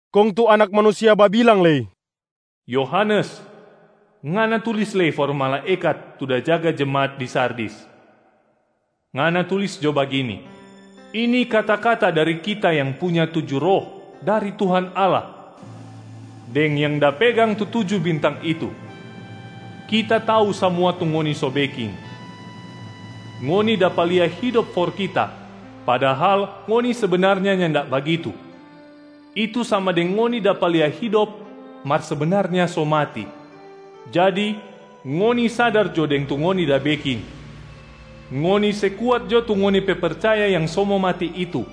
Kong tu Anak Manusia babilang lei, “Yohanes, ngana tulis lei for malaekat tu da jaga jemaat di Sardis. Ngana tulis jo bagini: Ini kata-kata dari Kita yang punya tuju Roh dari Tuhan Allah deng yang da pegang tu tuju bintang itu. Kita tau samua tu ngoni so beking. Ngoni dapa lia hidop for Kita padahal ngoni sebenarnya nyanda bagitu, itu sama deng ngoni dapa lia hidop mar sebenarnya so mati. Jadi ngoni sadar jo deng tu ngoni da beking, ngoni se kuat jo tu ngoni pe percaya yang so mo mati itu.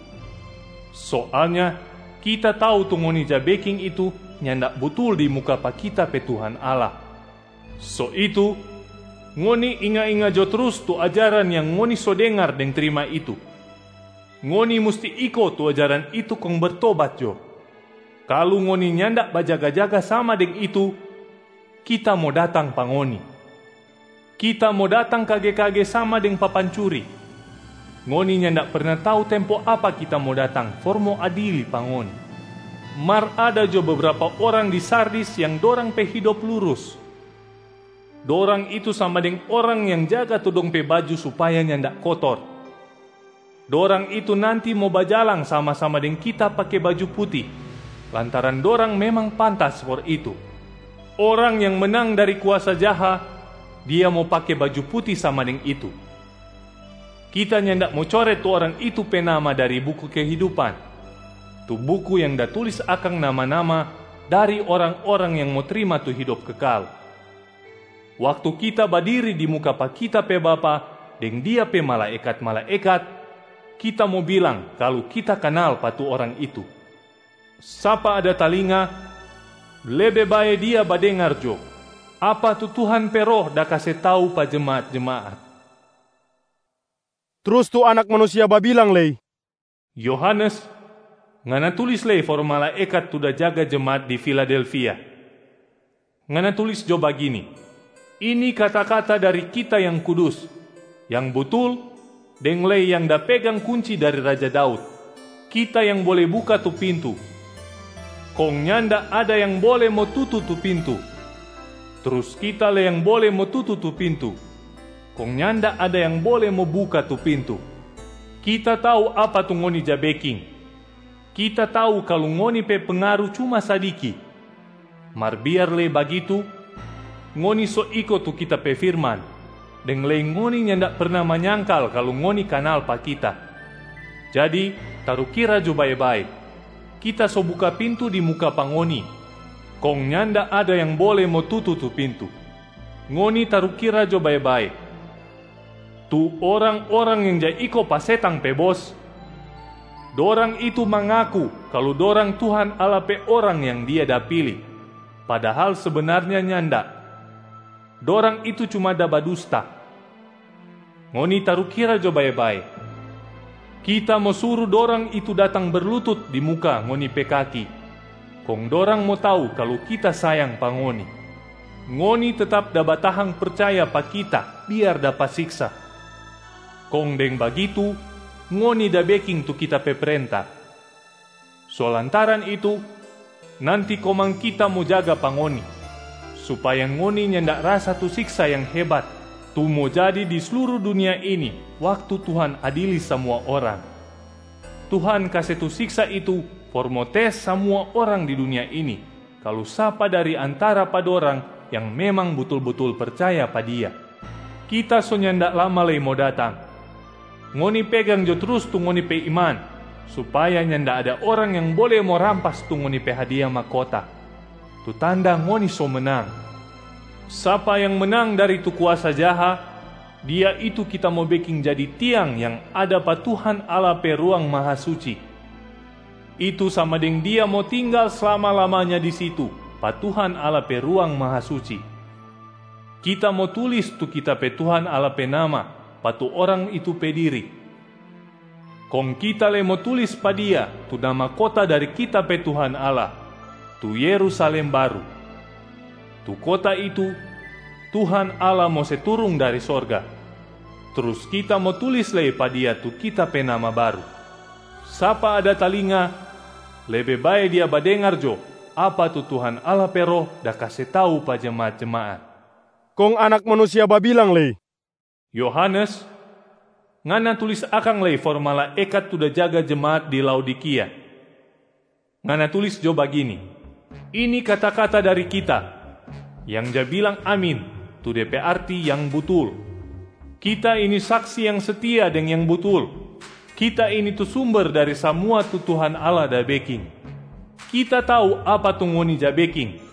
Soalnya Kita tau tu ngoni ja beking itu nyanda butul di muka pa Kita pe Tuhan Allah. So itu ngoni inga-inga jo trus tu ajaran yang ngoni so dengar deng trima itu. Ngoni musti iko tu ajaran itu kong bertobat jo. Kalu ngoni nyanda bajaga-jaga sama deng itu, Kita mo datang pa ngoni. Kita mo datang kage-kage sama deng papancuri, ngoni nyanda perna tau tempo apa Kita mo datang for mo adili pa ngoni. Mar ada jo bebrapa orang di Sardis yang dorang pe hidop lurus, dorang itu sama deng orang yang jaga tu dong pe baju supaya nyanda kotor. Dorang itu nanti mo bajalang sama-sama deng Kita pake baju puti, lantaran dorang memang pantas for itu. Orang yang menang dari kuasa jaha, dia mo pake baju puti sama deng itu. Kita nyanda mo coret tu orang itu pe nama dari buku kehidupan, tu buku yang da tulis akang nama-nama dari orang-orang yang mo trima tu hidop kekal. Waktu Kita badiri di muka pa Kita pe Bapa deng Dia pe malaekat-malaekat, Kita mo bilang kalu Kita kanal pa tu orang itu. Sapa ada talinga, lebe bae dia badengar jo apa tu Tuhan pe Roh da kase tau pa jemaat-jemaat.” Trus tu Anak Manusia babilang lei, “Yohanes, ngana tulis lei for malaekat tu da jaga jemaat di Filadelfia. Ngana tulis jo bagini: Ini kata-kata dari Kita Yang Kudus, Yang Butul, deng lei yang da pegang kunci dari raja Daud.a Kita yang bole buka tu pintu, kong nyanda ada yang bole mo tutu tu pintu. Trus Kita lei yang bole mo tutu tu pintu, kong nyanda ada yang bole mo buka tu pintu. Kita tau apa tu ngoni ja beking. Kita tau kalu ngoni pe pengaru cuma sadiki. Mar biar lei bagitu, ngoni so iko tu Kita pe firman deng lei ngoni nyanda perna manyangkal kalu ngoni kanal pa Kita. Jadi tarukira jo bae-bae, Kita so buka pintu di muka pa ngoni, kong nyanda ada yang bole mo tutu tu pintu. Ngoni tarukira jo bae-bae, tu orang-orang yang ja iko pa setang pe bos, dorang itu mangaku kalu dorang Tuhan Allah pe orang yang Dia da pili, padahal sebenarnya nyanda, dorang itu cuma da badusta. Ngoni tarukira jo bae-bae, Kita mo suru dorang itu datang berlutut di muka ngoni pe kaki, kong dorang mo tau kalu Kita sayang pa ngoni. Ngoni tetap da batahang percaya pa Kita biar dapa siksa, kong deng bagitu ngoni da beking tu Kita pe prenta. So lantaran itu, nanti komang Kita mo jaga pa ngoni supaya ngoni nyanda rasa tu siksa yang hebat tu mo jadi di sluru dunia ini waktu Tuhan adili samua orang. Tuhan kase tu siksa itu for mo tes samua orang di dunia ini kalu sapa dari antara pa dorang yang memang butul-butul percaya pa Dia. Kita so nyanda lama lei mo datang! Ngoni pegang jo trus tu ngoni pe iman supaya nyanda ada orang yang bole mo rampas tu ngoni pe hadia mahkota, tu tanda ngoni so menang. Sapa yang menang dari tu kuasa jaha, dia itu Kita mo beking jadi tiang yang ada pa Tuhan Allah pe Ruang Mahasuci, itu sama deng dia mo tinggal slama-lamanya di situ pa Tuhan Allah pe Ruang Mahasuci. Kita mo tulis tu Kita pe Tuhan Allah pe nama pa tu orang itu pe diri. Kong Kita lei mo tulis pa dia tu nama kota dari Kita pe Tuhan Allah, tu Yerusalem baru. Tu kota itu Tuhan Allah mo se turung dari sorga. Trus Kita mo tulis lei pa dia tu Kita pe nama baru. Sapa ada talinga, lebe bae dia badengar jo apa tu Tuhan Allah pe Roh da kase tau pa jemaat-jemaat.” Kong Anak Manusia babilang lei, “Yohanes, ngana tulis akang lei for malaekat tu da jaga jemaat di Laodikia. Ngana tulis jo bagini: Ini kata-kata dari Kita, yang ja bilang Amin tu de pe arti Yang Butul. Kita ini Saksi yang setia deng yang butul. Kita ini tu sumber dari samua tu Tuhan Allah da beking. Kita tau apa tu ngoni ja beking.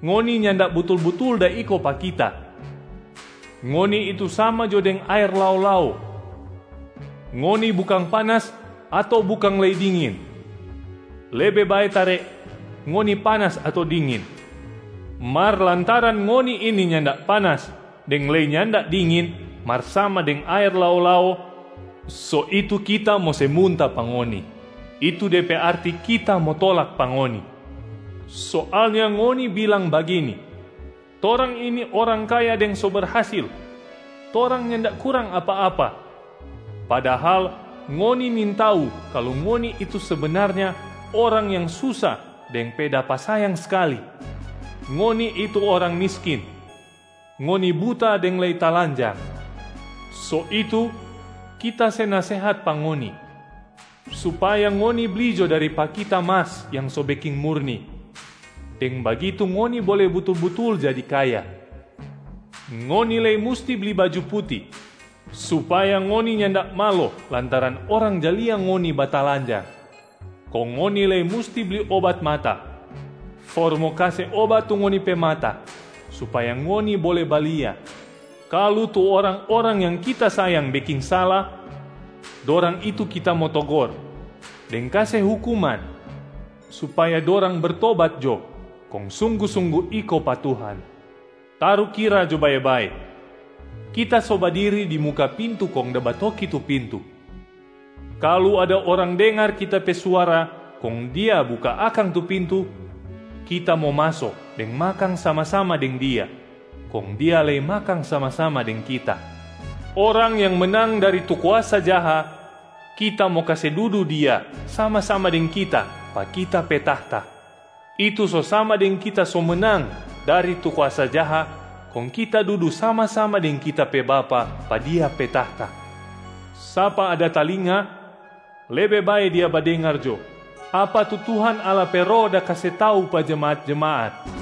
Ngoni nyanda butul-butul da iko pa Kita, ngoni itu sama jo deng aer lao-lao, ngoni bukang panas ato bukang lei dingin, lebe bae tare ngoni panas ato dingin. Mar lantaran ngoni ini nyanda panas deng lei nyanda dingin mar sama deng aer lao-lao, so itu Kita mo se munta pa ngoni, itu de pe arti Kita mo tolak pa ngoni. Soalnya ngoni bilang bagini, ‘Torang ini orang kaya deng so berhasil, torang nyanda kurang apa-apa,’ padahal ngoni nintau kalu ngoni itu sebenarnya orang yang susa deng pe dapa sayang skali, ngoni itu orang miskin, ngoni buta deng lei talanjang. So itu, Kita se nasehat pa ngoni supaya ngoni bli jo dari pa Kita mas yang so beking murni, deng bagitu ngoni bole butul-butul jadi kaya. Ngoni lei musti bli baju puti supaya ngoni nyanda malo lantaran orang ja lia ngoni batalanjang, kong ngoni lei musti bli obat mata for mo kase obat tu ngoni pe mata supaya ngoni bole balia. Kalu tu orang-orang yang Kita sayang beking sala, dorang itu Kita mo togor deng kase hukuman supaya dorang bertobat jo kong sunggu-sunggu iko pa Tuhan. Tarukira jo bae-bae, Kita so badiri di muka pintu kong da batoki tu pintu. Kalu ada orang dengar Kita pe suara kong dia buka akang tu pintu, Kita mo maso deng makang sama-sama deng dia, kong dia lei makang sama-sama deng Kita. Orang yang menang dari tu kuasa jaha, Kita mo kase dudu dia sama-sama deng Kita pa Kita pe tahta, itu so sama deng Kita so menang dari tu kuasa jaha kong Kita dudu sama-sama deng Kita pe Bapa pa Dia pe tahta. Sapa ada talinga, lebe bae dia badengar jo apa tu Tuhan Allah pe Roh da kase tau pa jemaat-jemaat.”